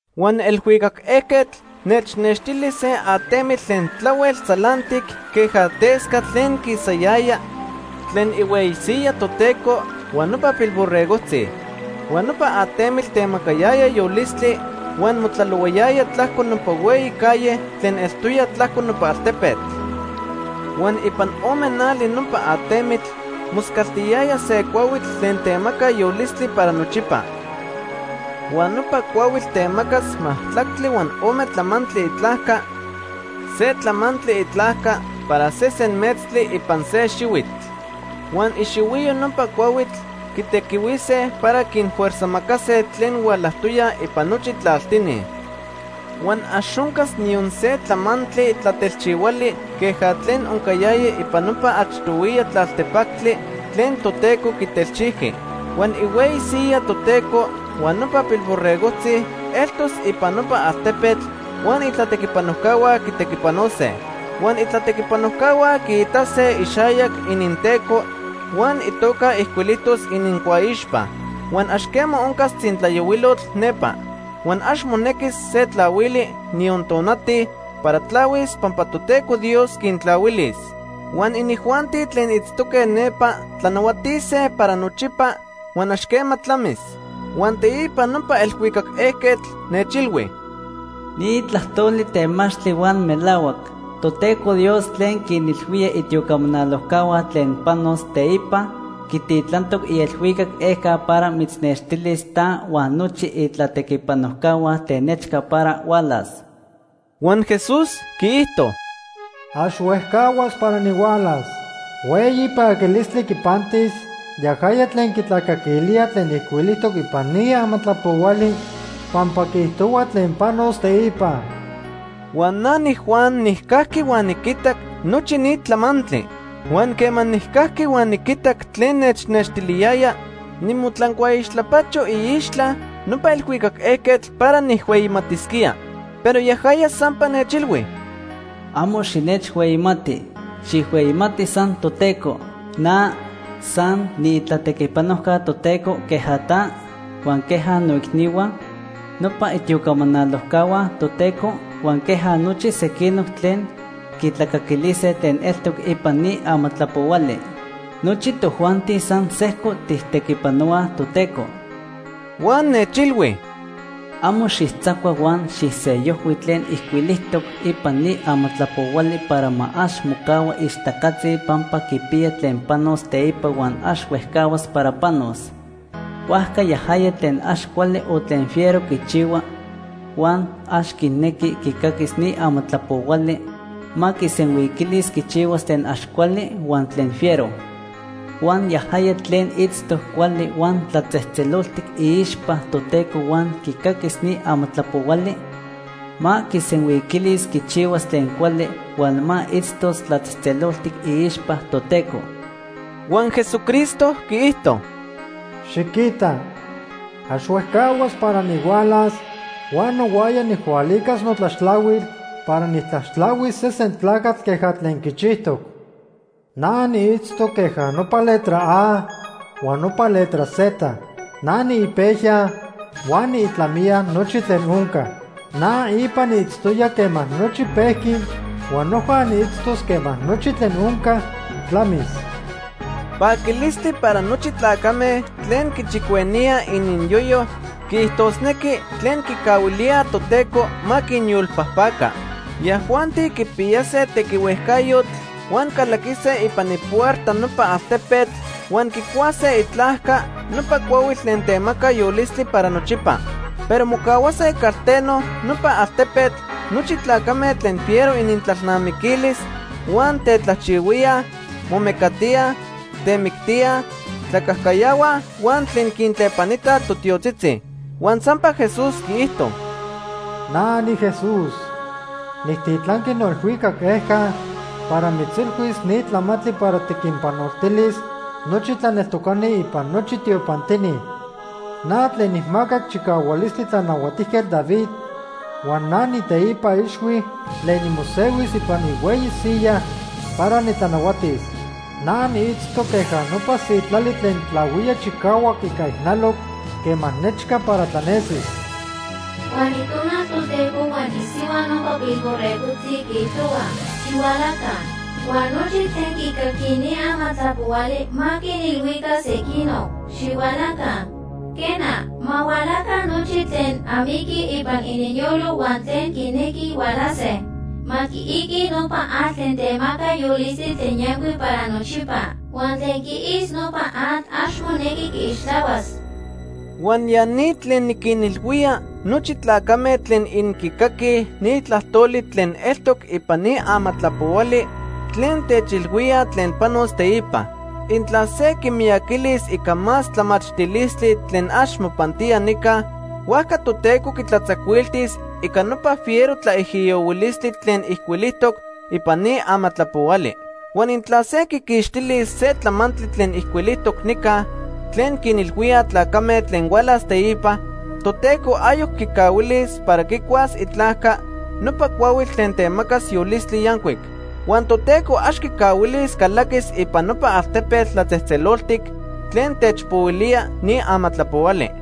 Huan elhuicac ejquetl nechnextili se atemitl tlen tlahuel tzalantic queja tescatl tlen quisayaya tlen ihueyi siyaj Toteco huan nopa Pilborregojtzi. Huan nopa atemitl temacayaya yolistli, huan motlalohuayaya tlajco nopa hueyi calle tlen eltoya tlajco nopa altepetl. Huan ipan ome nali nopa atemitl moscaltiyaya se cuahuitl tlen temaca yolistli para nochipa. Huan nopa cuahuitl temacas majtlactli huan ome tlamantli itlajca, se tlamantli itlajca para sesen metztli ipan se xihuitl. Huan ixihuiyo nopa cuahuitl quitequihuise para quinfuerzajmacase tlen hualajtoyaj ipan nochi tlaltini. Huan ax oncas niyon se tlamantli tlatelchihuali queja tlen oncayaya ipan nopa achtohuiya tlaltepactli tlen Toteco quitelchijqui. Huan ihueyi siyaj Toteco huan nopa Pilborregojtzi eltos ipan nopa altepetl huan itlatequipanojcahua quitequipanose. Huan itlatequipanojcahua quiitase ixayac ininTeco huan itoca ijcuilijtos inincuaixpa. Huan ax quema oncas tzintlayohuilotl nepa. Huan ax monequis se tlahuili, niyon tonati para tlahuis pampa Toteco Dios quintlahuilis. Huan inijuanti tlen itztoque nepa tlanahuatise para nochipa huan ax quema tlamis. Huan teipa nopa elhuicac ejquetl nechilhui: “Ni tlajtoli temachtli huan melahuac. Toteco Dios tlen quinilhuía itiocamanalojcahua tlen panos teipa, quititlantoc ielhuicac ejca para mitznextilis ta huan nochi itlatequipanojcahua tlen nechca para hualas.” Huan Jesús quiijto: “Ax huejcahuas para nihualas. Hueyi paquilistli quipantis yajaya tlen quitlacaquilía tlen ijcuilijtoc ipan ni amatlapohuali pampa quiijtohua tlen panos teipa.” Huan na niJuan nijcajqui huan niquitac nochi ni tlamantli. Huan quema nijcajqui huan niquitac tlen nechnextiliyaya, nimotlancuaixtlapacho iixtla nopa elhuicac ejquetl para nijhueyimatisquía. Pero yajaya sampa nechilhui: “Amo xinechhueyimati. Xijhueyimati san Toteco. Na san niitlatequipanojca Toteco queja ta, huan queja moicnihua, nopa itiocamanalojcahua Toteco, huan queja nochi sequinoc tlen quitlacaquilise tlen eltoc ipan ni amatlapohuali. Nochi tojuanti san sejco tijtequipanohuaj Toteco.” Huan nechilhui: “Amo xijtzacua huan xijsellojhui tlen ijcuilijtoc ipan ni amatlapohuali para ma ax mocahua ixtacatzi pampa quipiya tlen panos teipa huan ax huejcahuas para panos. Huajca yajaya tlen ax cuali o tlen fiero quichihua, huan ax quinequi quicaquis ni amatlapohuali, ma quisenhuiquilis quichihuas tlen ax cuali huan tlen fiero. Huan yajaya tlen itztoc cuali huan tlatzejtzeloltic iixpa Toteco huan quicaquis ni amatlapohuali, ma quisenhuiquilis quichihuas tlen cuali huan ma itztos tlatzejtzeloltic iixpa Toteco.” Huan Jesucristo quiijto: “Xiquita ax huejcahuas para nihualas huan nohuaya nijhualicas notlaxtlahuil para nijtlaxtlahuis sesen tlacatl queja tlen quichijtoc. Na niitztoc queja nopa letra A huan nopa letra Z. Na niipejya huan niitlamiya nochi tlen onca. Na ipa niitztoya quema nochi pejqui huan noja niitztos quema nochi tlen onca tlamis.” Paquilistli para nochi tlacame tlen quichicueníaj ininyoyo, quiijtosnequi, tlen quicahuilía Toteco ma quinyolpajpaca. Yajuanti quipiyase tequihuejcayotl huan calaquise ipan ipuerta nopa altepetl huan quicuase itlajca nopa cuahuitl tlen temaca yolistli para nochipa. Pero mocahuase calteno nopa altepetl nochi tlacame tlen fiero inintlalnamiquilis huan tetlajchihuíaj, momecatíaj, temictíaj, tlacajcayahuaj huan tlen quintlepanitaj totiotzitzi. Huan sampa Jesús quiijto: “Na niJesús, nijtitlanqui noelhuicac ejca para mitzilhuis ni tlamantli para tiquinpanoltilis nochi tlaneltocani ipan nochi tiopantini. Na tlen nijmacac chicahualistli Tlanahuatijquetl David huan na niiteipa ixhui tlen nimosehuis ipan ihueyi siyaj para nitlanahuatis. Na niitztoc queja nopa sitlali tlen tlahuía chicahuac ica ijnaloc quema nechca para tlanesis.” Huan Itonal Toteco huan isihua nopa Pilborregojtzi quiijtohuaj: “Xihualaca.” Huan nochi tlen quicaquij ni amatlapohuali ma quinilhuica sequinoc: “Xihualaca.” Quena, ma hualaca nochi tlen amiquij ipan ininyolo huan tlen quinequij hualase. Ma quiiquij nopa atl tlen temaca yolistli tlen yancuic para nochipa. Huan tlen quiis nopa atl ax monequi quiixtlahuas. Huan ya ni tlen niquinilhuía nochi intlacame tlen inquicaquij ni tlajtoli tlen eltoc ipan ni amatlapohuali tlen techilhuía tlen panos teipa. Intla se quimiyaquilis ica más tlamachtilistli tlen ax mopantía nica, huajca Toteco quitlatzacuiltis ica nopa fiero tlaijiyohuilistli tlen ijcuilijtoc ipan ni amatlapohuali. Huan intla se quiquixtilis se tlamantli tlen ijcuilijtoc nica tlen quinilhuía tlacame tlen hualas teipa, Toteco ayoc quicahuilis para quicuas itlajca nopa cuahuitl tlen temaca yolistli yancuic. Huan Toteco ax quicahuilis calaquis ipan nopa altepetl tlatzejtzeloltic tlen techpohuilía ni amatlapohuali.